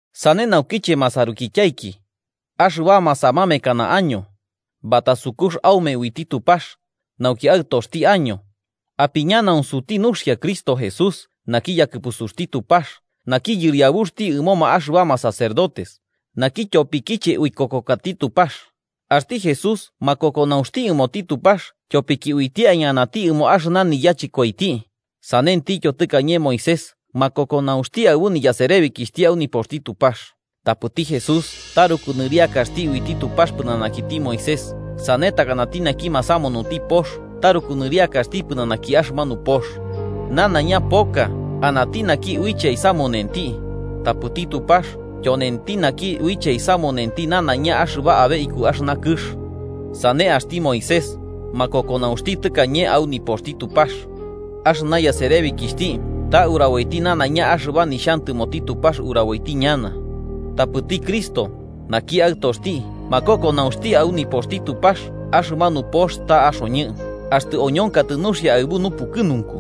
Sane naukiche, masarukityaiki, axɨbama samamekana año, batasukux aume uiti Tupax nauki aɨtoxti año, apiñanaunsuti nuxia Cristo Jesús naki yakɨpusuxti Tupax naki Yɨriabuxti ɨmoma axɨbama sacerdotes, naki tyopikiche uikokokati Tupax. Axti Jesús makokonaunxti ɨmoti Tupax tyopiki uiti aiñanati ɨmo axɨna niyachɨkoiti, sanentityo tɨkañe Moisés makokonaunxti aɨbu niyaserebikixhti au nipoxti Tupax. Tapɨti Jesús taruku nɨriakaxti uiti Tupax pɨnanakiti Moisés, sane takanati naki masamunuti pox taruku nɨriakaxti pɨnanaki axɨmanu pox. Nanaiña poka anati uiche aisamunenti, tapɨti Tupax tyonenti naki uiche aisamunenti nanaiña axɨba abe iku axɨna kɨx. Sane, axti Moisés makokonaunxti tɨkañe au nipoxti Tupax, axɨna yaserebikixhti ta uraboiti nanaiña axɨba nixhantɨmoti Tupax uraboiti ñana. Tapɨti Cristo, naki Aɨtoxti, makokonaunxti au nipoxti Tupax axɨmanu pox ta axoñɨ, axtɨ oñonkatɨ nuxia aɨbu nupukɨnunku.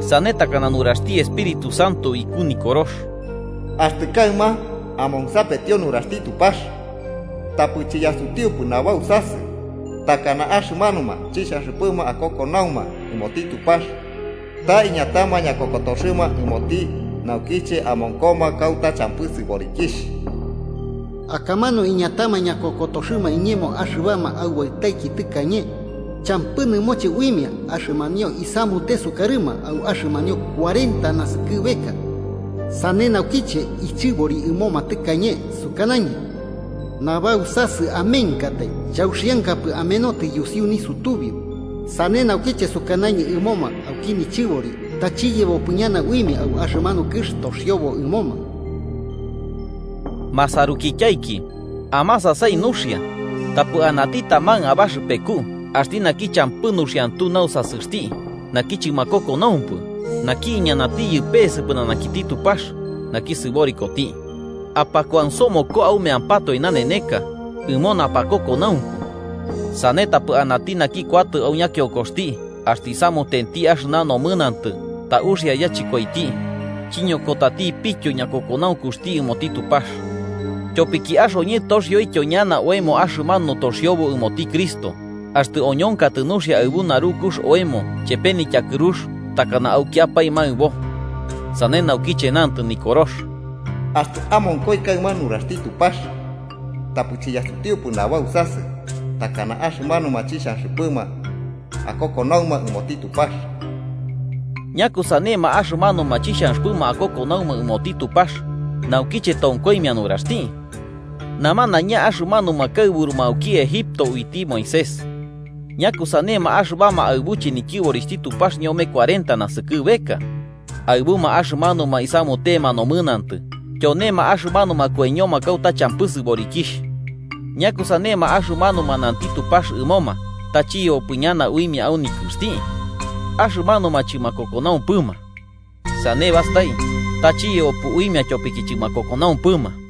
Sane, takana nuraxti Espíritu Santo iku Nikorox: “Axtɨ kaɨma amonsapetio nuraxti Tupax, tapɨ chiyasutiupɨ nabausasɨ takana axɨmanuma chixhanxɨpɨma akokonauma ɨmoti Tupax ta iñatama ñakokotoxɨma ɨmoti naukiche amonkoma kauta champɨti sɨborikixh. Akamanu iñatama ñakokotoxɨma iñemo axɨbama aubaɨtaiki tɨkañe, champɨ nɨmoche uimia axɨmanio isamute sukarɨma au axɨmanio cuarenta naskɨbeka. Sane naukiche ichɨbori ɨmoma tɨkañe, sukanañɨ: ‘Nabausasɨ amenkatai, chauxiankapɨ amenotɨ yusiuki nisutubiu.’ Sane naukiche sukanañɨ ɨmoma auki nichɨbori ta chiyebopɨ ñana uimia au axɨmanu kɨx toxiobo ɨmoma.” Masarukityaiki, amasasai nuxia, tapɨ anati taman abaxɨpeku axti naki champɨ nuxiantu nausasɨxti naki chɨmakokonaumpɨ naki iñanatiyɨ pese pɨnanakiti Tupax naki sɨborikoti. Apakuansomoko aumeampatoe naneneka, ɨmo napakokonaunku. Sane tapɨ anati naki kuatɨ au ñakionkoxti axtɨ isamutenti axɨna nomɨnantɨ ta uxia yachɨkoiti, chiñokotatipityo ñakokonaunkuxti ɨmoti Tupax. Tyopiki axoñɨ toxioityo ñana oemo axɨmanu toxiobo ɨmoti Cristo, axtɨ oñonkatɨ nuxia aɨbu narukux oemo chepe nityakɨrux takana aukiapae maɨbo. Sane naukiche nantɨ Nikorox: “Axtɨ amonkoi kaɨma nuraxti Tupax, tapɨ chiyasutiupɨ nabausasɨ takana axɨmanuma chixhanxɨpɨma akokonauma ɨmoti Tupax.” ¿Ñakusanema axɨmanuma chixhanxɨpɨma akokonauma ɨmoti Tupax naukiche tonkoimia nuraxti? Namanaiña axɨmanuma kaɨburuma auki Egipto uiti Moisés. ¿Ñakusanema axɨbama aɨbuche nityɨborixhti Tupax ñome kuarenta naskɨbeka? Aɨbuma axɨmanuma isamutema nomɨnantɨ, tyonema axɨmanuma koiñoma kauta champɨ sɨborikixh. ¿Ñakusanema axɨmanuma nanti Tupax ɨmoma ta chiyebopɨ ñana uimia au nikɨxti? Axɨmanuma chɨmakokonaumpɨma. Sane bastai, ta chiyebopɨ uimia tyopiki chɨmakokonaumpɨma.